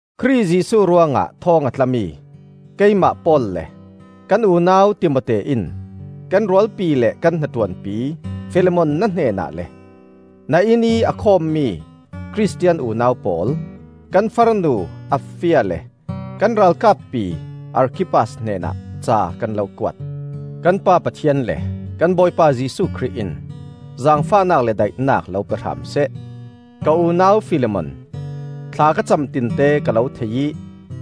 Khrih Jesuh ruangah thawng a tlami keimah Paul le kan unau Timote in kan rualpi le kan hnaṭuanpi Filemon na hnenah le, na innih a khawmmi Khristian unau pawl, kan farnu Apfia le kan ralkappi Arkhippas hnenah ca kan lo kuat. Kan Pa Pathian le kan Bawipa Jesuh Khrih in zaangfahnak le daihnak lo pe hram seh. Ka unau Filemon, thla ka cam tinte ka lo thei ih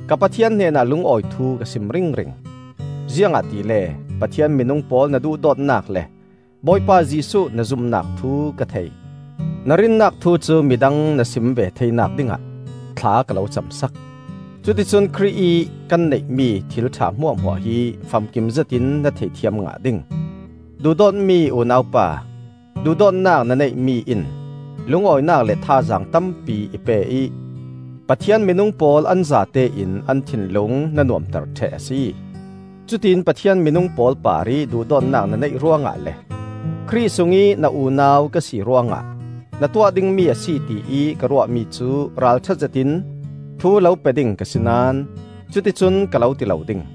ka Pathian hnenah lungawi thu ka sim ringring. Ziangahtile Pathian minung pawl na duhdawtnak le Bawipa Jesuh na zumnak thu ka thei. Na rinnak thu cu midang na sim ve theinak dingah thla ka lo cah sak; cuticun Khrih ih kan neihmi thilṭha hmuahhmuah hi famkim zetin na theithiam ngah ding. Duhdawtmi unau pa, duhdawtnak na neihmi in lungawinak le thazaang tampi i pe ih Pathian minung pawl an zatein an thinlung na nuamter ṭheh a si. Cutiin Pathian minung pawl parih duhdawtnak na neih ruangah le Khrih sungih na unau ka si ruangah na tuah dingmi a si ti ih ka ruahmi cu ralṭha zetin thu lo pe ding ka si naón cuticun ka lo ti lo ding.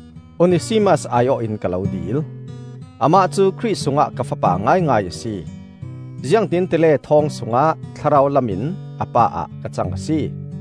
Onesimas ai-awh in ka lo dil. Amah cu Khrih sungah ka fapa ngaingai a si; ziangtin tile thawng sungah thlarau lamin a pa ah ka cang a si.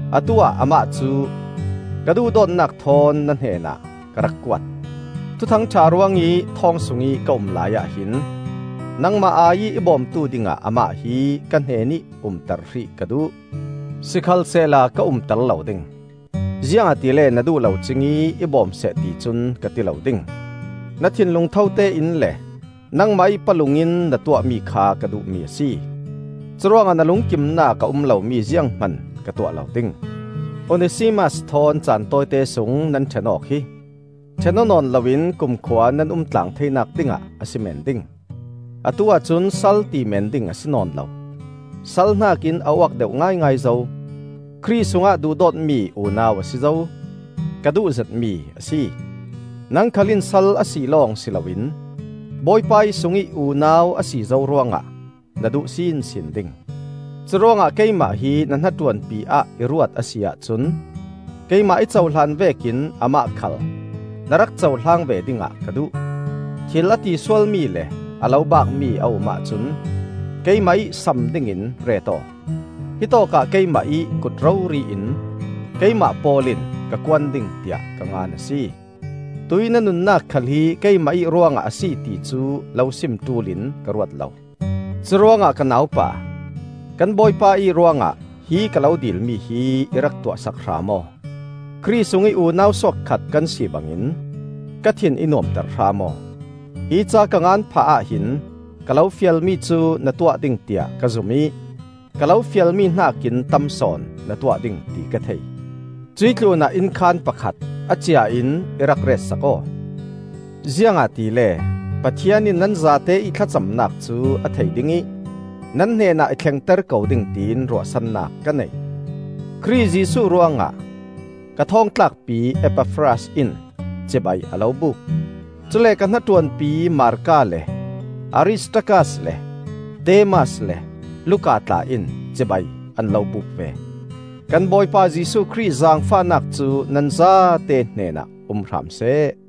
Atu-ah amah cu ka duhdawtnak thawn na hnenah ka rak kuat. Thuthang ṭha ruangih thawng sungih ka um laiah hin, nangmah ai-ih i bawmtu dingah amah hi ka hnenih umter hrih ka duh. Sikhalsehla ka umter lo ding; ziangahtile na duh lo cingih i bawm seh ticun ka ti lo ding. Na thinlung thote in le nangmah ih palung in na tuahmi kha ka duhmi a si. Curuangah na lungkimnak a um lomi zianghman ka tuah lo ding. Onesimas thawn caan tawite sung nan ṭhen awk hi ṭhen aw nawn loin kumkhua nan umtlang theinak dingah a si meen ding. Atu-ah cun sal ti meen ding a si nawn lo; sal hnakin a uak deuh ngaingai zo: Khrih sungah duhdawtmi unau a si zo. Ka duhzetmi a si. Nang khal in sal a si lawng si loin Bawipa ih sungih unau a si zo ruangah na duh sinsin ding. Curuangah keimah hi na hnaṭuanpi ah i ruat a si ahcun keimah i cohlan vekin amah khal na rak cohlang ve dingah ka duh. Thil a ti sualmi le a lo baakmi a um ahcun keimah ih sam dingin ret aw. hittawk ah keimah ih kut rori in, Keimah Paul in ka kuan ding tiah ka ngan a si. (Tuih na nunnak khal hi keimah ih ruangah a si ti cu lo sim ṭul in ka ruat lo.) Curuangah ka naupa, kan Bawipa ih ruangah hi ka lo dilmi hi i rak tuahsak hram aw; Khrih sungih unau suak khat kan si bangin ka thin i nuamter hram aw. Hi ca ka ngan phah ahhin ka lo fialmi cu na tuah ding tiah ka zum ih ka lo fialmi hnakin tam sawn na tuah ding ti ka thei. Cuih tlunah innkhaan pakhat a ciain i rak ret sak aw. Ziangahtile Pathian in nan zate ih thlacamnak cu a thei ding ih nan hnenah i thlengter ko ding tiin ruahsannak ka nei. Khrih Jesuh ruangah ka thawngtlakpi Epafras in cibai a lo buk. Cule ka hnaṭuanpi Marka le Aristarkas le Demas le Luka tla in cibai an lo buk ve. Kan Bawipa Jesuh Khrih zaangfahnak cu nan zate hnenah um hram seh.